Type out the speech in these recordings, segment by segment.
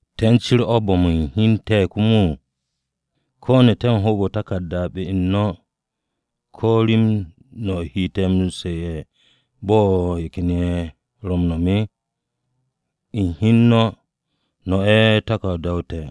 ¿Te̱ u̱n cir o̱ bo̱m u̱n hi u̱n te̱ komo? ¿Ko̱ ne̱ te̱ u̱n hoob-o̱ u̱n taku̱rda be-u̱r no̱ ko̱ rem no̱ o̱ he te̱ m-su̱'e̱ bo̱ ye̱ ken ye̱ ro̱ m-no̱m? No̱ u̱n hi u̱n no̱, no̱ ye̱ ro̱ taku̱rda-o te̱,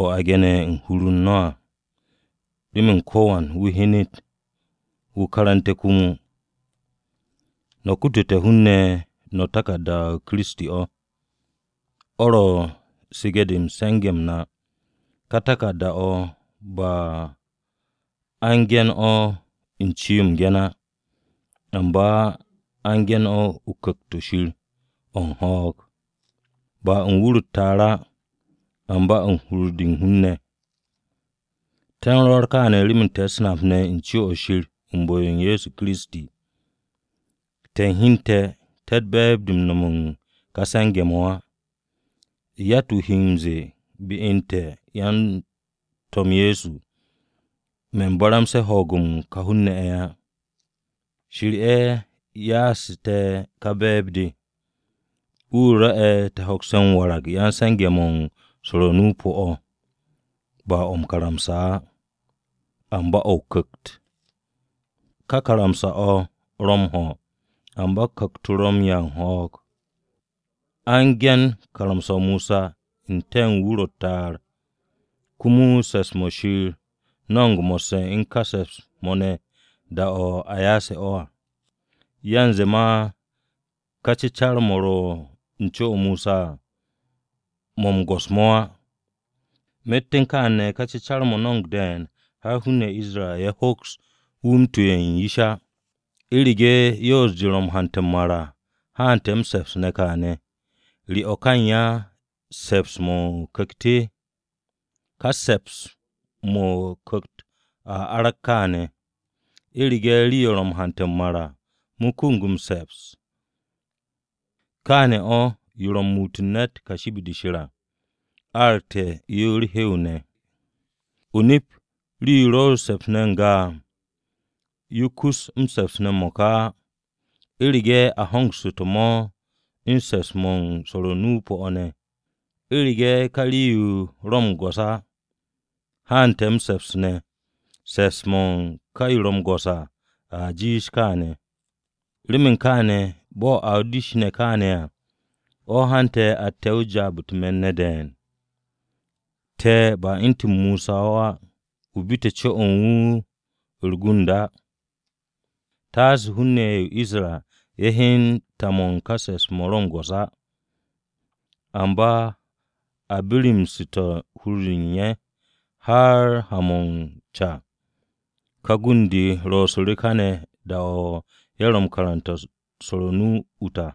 o̱ a gene̱ u̱n hur-u̱r no̱ à, remen ko̱wan wu̱ hyenet, wu̱ karante̱ komo. No̱ kutute̱ hun-ne̱ u̱nze no̱ taku̱rda-o Kiristi o̱, o̱ ro̱ su̱ge̱-de u̱n se̱nge̱-m na. Ka taku̱rda-o̱ ba a u̱n ge̱n o̱ u̱n ce-yo m-ge̱n á, amba a u̱n ge̱n o̱ u̱n Ku̱kt-o̱ Shir o̱ u̱n ho̱o̱g. Ba u̱n wur-o̱ u̱t-ta'ar á, amba u̱n hur-de u̱n hun-ne̱. Te̱ u̱n rwo̱r kaane̱ remen te̱ u̱s-nap ne̱ u̱n co-o̱ Shir u̱n bu̱-o Ye̱so Kiristi. Te̱ u̱n hi u̱n te̱ te̱tt be̱e̱b-de u̱n no̱m u̱n ka se̱nge̱-mo̱ á. Yatt-wu̱ he m-ze̱e̱ be u̱n te̱ yan-To̱m Ye̱so, “Me̱n baramse̱ ho̱o̱g-mo̱ u̱n ka hun-ne̱ á.” Shir ye̱ yasu̱ te̱ ka be̱e̱b-de. Wu̱ rwo̱'e̱ te̱ hokste̱ m-warag ya-m-se̱nge̱-mo̱ u̱n swo̱r o-nu o-pu̱ o̱, ba o̱ o-karamsa á, amba o̱ o-Ku̱kt. Ka karamsa-o̱ ro̱ m-ho̱, amba Ku̱kt-o ro̱ u̱n 'ya u̱n ho̱o̱g. A u̱n ge̱n karamsa-o Mosa n-te̱ u̱n wur-o̱ u̱t-ta'ar, komo se̱ps-mo̱ Shir no̱mo̱g mo̱sse̱ u̱n ka se̱ps-mo̱ ne̱ da-o̱ a yase̱ o̱ à. Yanze ma ka cecar-mo̱ ro u̱n co-o Mosa à mo̱ m-go̱s-mo̱ á. Myet u̱n kaane̱ ka cecar-mo̱ no̱mo̱g de̱e̱n har hun-ne̱ ye̱ o-Isra ye̱ hoks wu̱ m-tuwe̱ u̱n yish á. U̱rege̱ yoos-de ro̱ m-hante̱ m-mar à haante̱ m-se̱ps ne̱ kaane̱, ¿re o̱ ka u̱n ya se̱ps-mo̱ o-Ku̱kt? Ká se̱ps-mo̱ o-Ku̱kt mo̱ a arag kaane̱. U̱rege̱ rii-yo ro̱ m-hante̱ m-mar à, kumug m-se̱ps. Kaane̱ o̱ yo ro̱ m-muut u̱n ne̱t kashi be-de Shir à, aragte̱ yo u̱r-hew ne̱. O-nip, rii-yo ro m-se̱ps ne̱ n-ga à, yo kus m-se̱ps ne̱ m-mo̱ka á, u̱rege̱ a hongsu̱te̱ mo̱ u̱n se̱ps-mo̱ u̱n swo̱r-o nu-o pu̱-o̱ ne̱. U̱rege̱ ka rii-yo ro̱ m-go̱s á, haante̱ m-se̱ps ne̱, se̱ps-mo̱ u̱n ka yo ro̱ m-go̱s à, a jiish kaane̱. Remen kaane̱, bo̱ a o-dish ne̱ kaane̱ à, o̱ hante̱ atte̱ u̱n jaab-o̱ u̱t-me̱n ne̱ de̱e̱n. Te̱ ba u̱ntu̱n Mosa o̱ á, wu̱ bite̱ co-o̱ u̱n wu̱ u̱r-gund à, taase hun-ne̱ ye̱ o-Isra ye̱ hyen ta-mo̱ u̱n ka se̱ps-mo̱ ro̱ m-go̱s á. Amba a birimsu̱te̱ hur-de u̱n ye̱. Har ha-mo̱ u̱n ca ka gund-de ro̱su̱ káne̱ da-o̱ ye̱ ro m-karante̱ u̱n swo̱r o-nu ut à,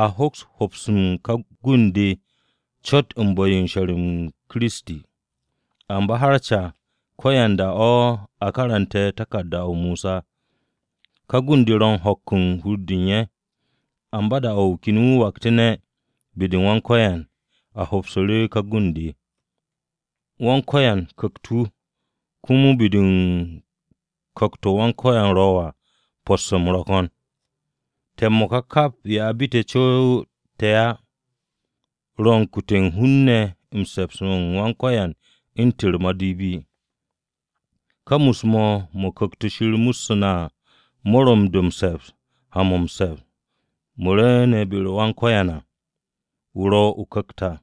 a hoks m-hops u̱n ká gund-de cot u̱n bu̱-yo m-she̱r u̱n Kiristi. Amba har ca, ko̱yanda o̱ a karante̱ taku̱rda-o Mosa, ka gund-de ro̱ u̱n ho̱k u̱n hur-de u̱n ye̱. Amba da-o̱ wu̱ ken wu̱ waktu̱nde̱ be-u̱r Wan-Ko̱yan, a hopsu̱ru̱ ka gund-de. Wan-Ko̱yan Ku̱kt-o̱, komo be-de u̱n Ku̱kt-o Wan-Ko̱yan ro̱ à, po̱sse̱-m ro̱ ko̱n. Te̱ m-mo̱ka kap ye̱ a bite̱ co-u̱s te̱ á, ro̱ u̱n kute̱ u̱n hun-ne̱ se̱ps-m Wan-Ko̱yan u̱ntu̱n u̱r-madipi. Ka mus-mo̱, mo̱ Ku̱kt-o̱ Shir mussu̱ na à, mo̱ ro̱ m-do̱ m-se̱ps ha-mo̱ m-se̱ps mo̱ rwu̱u̱ne̱ be-u̱r Wan-Ko̱yan à, wu̱ ro̱ o-Ku̱kt à.